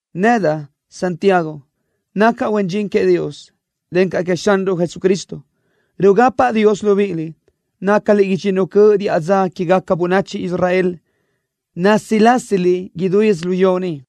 Nedaʼ, Jacobo, nacaʼ huen dxin queëʼ Dios, encaʼ queëʼ Xanruʼ Jesucristo. Rugapaʼ Dios libíʼiliʼ, nácaliʼ idxinnu cöʼ diʼa dza quégaca bönachi Israel, násilasiliʼ idú yödzölió ni.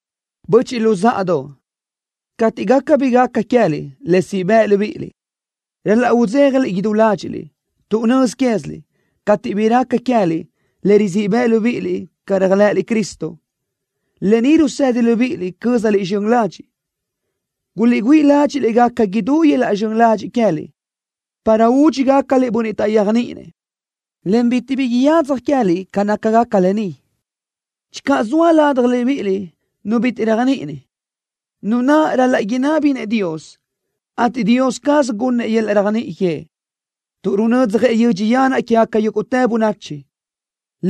Böchiʼ luzáʼadoʼ, cateʼ gaca bi gaca queë́liʼ le siʼ bëʼ libíʼiliʼ, ral-laʼ udzéjaliʼ idú ládxiʼliʼ tuʼ nöz quéziliʼ, cateʼ bi raca queë́liʼ le rizíʼ bëʼ libíʼiliʼ ca réajlëʼëliʼ Cristo, lë ni rusedi libíʼiliʼ cö́zaliʼ zxön ladxiʼ. Guliʼgüíʼ ládxiʼliʼ gaca idú yöl-laʼ zxön ladxiʼ queë́liʼ, para údxi gácaliʼ bönniʼ taʼyéajniʼinëʼ, en bitiʼ bi yadzaj queë́liʼ ca nácagaca lë ni. Channö zoa ladaj libíʼiliʼ nu bitiʼ réajniʼini, nu naʼ ral-laʼ inabi-nëʼ Dios, ateʼ Dios caz gunnëʼ yöl-laʼ réajniʼi que, tuʼ runödzjëʼ yödxi yanaʼ quégaca yúguʼtë bönachi,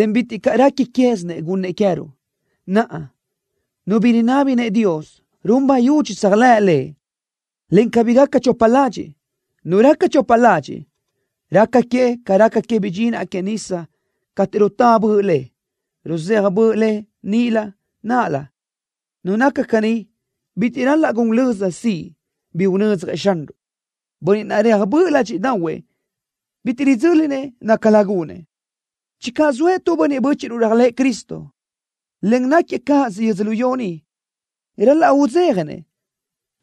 en bitiʼ caʼ réqui quézinëʼ gunnëʼ queë́ruʼ. Naʼa, nu bi rinabi-nëʼ Dios, run bayudxi tséajlëʼ Lëʼ, en cabí gaca chopa ladxiʼ. Nu raca chopa ladxiʼ, raca que ca raca que bidxinaʼ que nísadoʼ cateʼ rutá böʼ le, ruzéaj böʼ le nilö náʼalö. Nu naca caní bitiʼ ral-laʼ gun löza siʼ bi unödzjëʼ Xanruʼ. Bönniʼ naʼ reaj böʼ ládxiʼdaʼahuëʼ bitiʼ ridzö́linëʼ nácalö gunëʼ. Channö zoëʼ tu bönniʼ bö́chiʼruʼ réajlëʼë Cristo, en náquiëʼ cáʼasö yödzölió ni, ral-laʼ udzéjanëʼ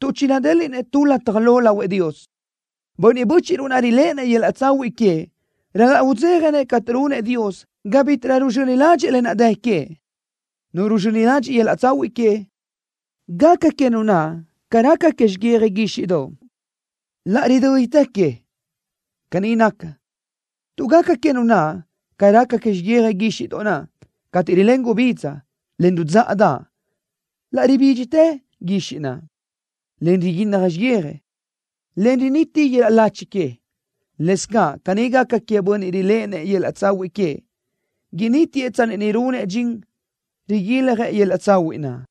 tuʼ chinadéliʼnëʼ tu lataj lo lahuëʼ Dios. Bönniʼ bö́chiʼruʼ naʼ riléʼenëʼ yöl-laʼ tsahuiʼ queëʼ ral-laʼ udzéjanëʼ cateʼ runëʼ Dios ga bítiʼrö ruzxöni ládxëʼë lë naʼ dë queëʼ. Nu ruzxöni ladxiʼ yöl-laʼ tsahuiʼ que, gaca que nu naʼ ca raca que xiyija guíxiʼdoʼ, laʼ ridö́ditë que. Caní naca, tuʼ gaca que nu naʼ ca raca que xiyija guíxiʼdoʼ naʼ cateʼ rilén gubidza, en rudzáʼadaʼ, laʼ ribídxitë guixiʼ naʼ, en riguínnaj xiyija, en riniti yöl-laʼ lachi que. Lëscaʼ caní gaca queëʼ bönniʼ riléʼenëʼ yöl-laʼ tsahuiʼ queëʼ, inítiëʼ tsanni ni runëʼ dxin riguiljëʼ yöl-laʼ tsahuiʼ naʼ.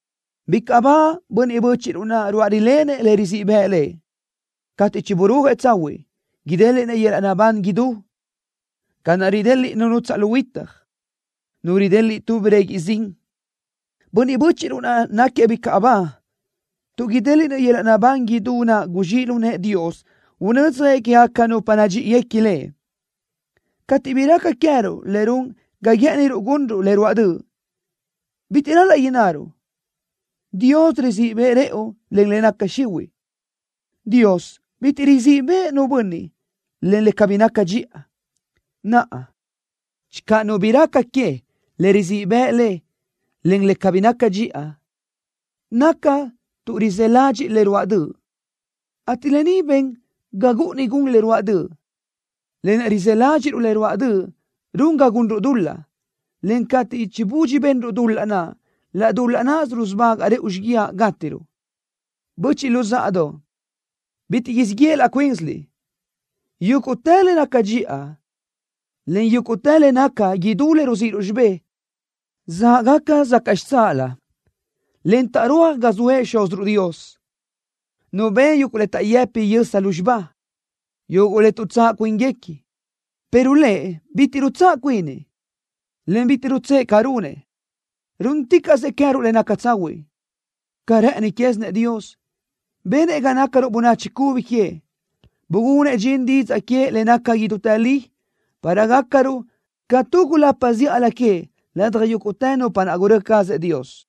Bicaʼ ba bönniʼ bö́chiʼruʼ naʼ ruáʼ rilenëʼ le rizíʼ bëʼ lëʼ. Cateʼ chiburúajëʼ tsahuiʼ, idéliʼnëʼ yöl-laʼ naʼbán idú, ca naʼ rideliʼ nu nutsaʼ lu huitaj, nu rideliʼ tu breguiʼ zin. Bönniʼ bö́chiʼruʼ naʼ náquiëʼ bicaʼ ba tuʼ idéliʼnëʼ yöl-laʼ naʼbán idú naʼ guzxíʼ lu nëʼë Dios unödzjëʼ quégaca nupa nadxíʼiguequi Lëʼ. Cateʼ bi raca queë́ruʼ le run ga guë́ʼëniruʼ gunruʼ le ruáʼ döʼ, bitiʼ ral-laʼ innaruʼ: “Dios rizíʼ bëʼë rëʼu len le naca xihuiʼ.” Dios bitiʼ rizíʼ bëʼë nu bönniʼ len le cabí naca dxiʼa. Naʼa, channö nu bi raca que le rizíʼ bëʼ le len le cabí naca dxiʼa, naca tuʼ rizë́ ladxiʼ le ruáʼ döʼ, ateʼ lë ni ben ga gúʼuni gun le ruáʼ döʼ. Lë naʼ rizë́ ládxiʼruʼ le ruáʼ döʼ run ga gunruʼ dul-laʼ, en cateʼ chibudxi benruʼ dul-laʼ naʼ, laʼ dul-laʼ náʼasö rusubagaʼ rëʼu xíguiaʼ gátiruʼ. Böchiʼ luzáʼadoʼ, bitiʼ siʼ yeʼe laʼ cuínsiliʼ. Yúguʼtë le naca dxiʼa, en yúguʼtë le naca idú le ruzíʼiruʼ xibé, záʼgaca sacaʼ xitsáʼalö, en taʼrúaj ga zoëʼ Xúziruʼ Dios, Nu ben yuguʼ le taʼyëpi yösa lúzxiba, yuguʼ le tuʼtsáʼ cuínguequi, pero Lëʼ bitiʼ rutsáʼ cuinëʼ, en bitiʼ rutsë́ʼë ca runëʼ, rúnnaticaʼsëʼ queë́ruʼ le naca tsahuiʼ. Ca rë́ʼëni quézinëʼ Dios, benëʼ ga nácaruʼ bönachi cubi queëʼ. Bugunëʼ dxin didzaʼ queëʼ le naca idútë li, para gácaruʼ ca tu gulapa zíʼalö queëʼ ladaj yúguʼtë nupa naʼ gurö́ cazëʼ Dios.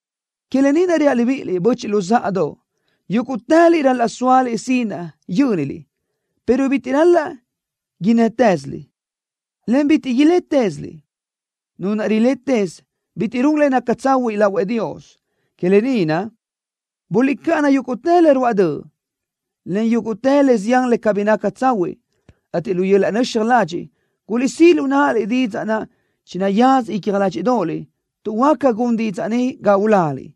Que lë ni naʼ reaʼ libíʼiliʼ, böchiʼ luzáʼadoʼ, yúguʼtëliʼ ral-laʼ sóaliʼ sinaʼ yö́niliʼ, pero bitiʼ ral-laʼ innë́tëziliʼ, en bitiʼ ilétëziliʼ. Nu naʼ riletëz bitiʼ run le naca tsahuiʼ lahuëʼ Dios. Que lë ni naʼ, guliʼcáʼana yúguʼtë le ruáʼ döʼ, en yúguʼtë le zián le cabí naca tsahuiʼ, ateʼ lu yöl-laʼ nöxaj ladxiʼ guliʼsíʼ lu náʼaliʼ didzaʼ naʼ chinayaza icja ládxiʼdoʼoliʼ, tuʼ huáca gun didzaʼ ni ga uláliʼ.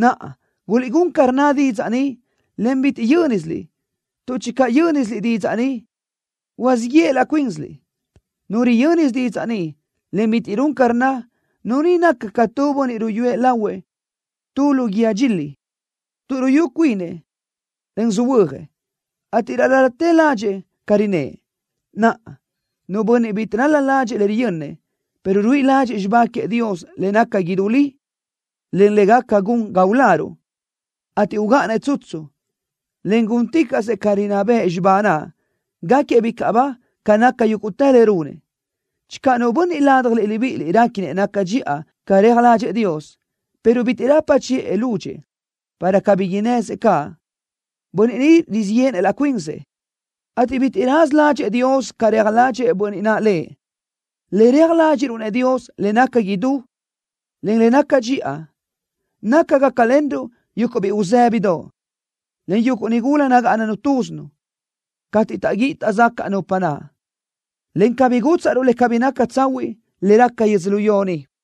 Naʼa, guliʼgún ca rnna didzaʼ ni, en cabí yö́nisiliʼ, tuʼ channö yö́nisiliʼ didzaʼ ni, siʼ yéʼeliʼ laʼ cuínsiliʼ. Nu riyö́nisö didzaʼ ni, en bitiʼ run ca rnna, nu ni naca ca tu bönniʼ ruyúëʼ lahuëʼ tu lu guíë dxili, tuʼ ruyú cuinëʼ, en söhuö́jëʼ, ateʼ laʼ ral-latë ládxëʼë ca rinë́ʼë. Naʼa, nu bönniʼ bitiʼ ral-la ládxëʼë le riyönnëʼ, pero ruíʼi ládxëʼë xibá queëʼ Dios le naca idú li, en le gaca gun ga uláruʼ, ateʼ ugáʼanëʼ tsutsu, en gúnticaʼsëʼ ca rinná bëʼ xibá naʼ, gaquiëʼ bicaʼ ba ca naca yúguʼtë le runëʼ. Channö nu bönniʼ ladaj libíʼiliʼ réquinëʼ naca dxiʼa ca reaj ládxëʼë Dios, pero bitiʼ rapa chiʼë lúdxëʼë para cabí innësëʼ caʼ, bönniʼ ni rizíʼ yéʼenëʼ laʼ cuinsëʼ, ateʼ bitiʼ raza ládxëʼë Dios ca reaj ládxëʼë bönniʼ naʼ Lëʼ. Le reaj ládxiʼruʼ-nëʼ Dios, le naca idú, en le naca dxiʼa, naca gácalenruʼ yuguʼ biʼi uzë́bidoʼ, encaʼ yuguʼ nigula nagáʼananu túzinu, cateʼ taʼguíʼi taʼzacaʼ nupa naʼ, en cabí gútsaʼruʼ le cabí naca tsahuiʼ le raca yödzölió ni.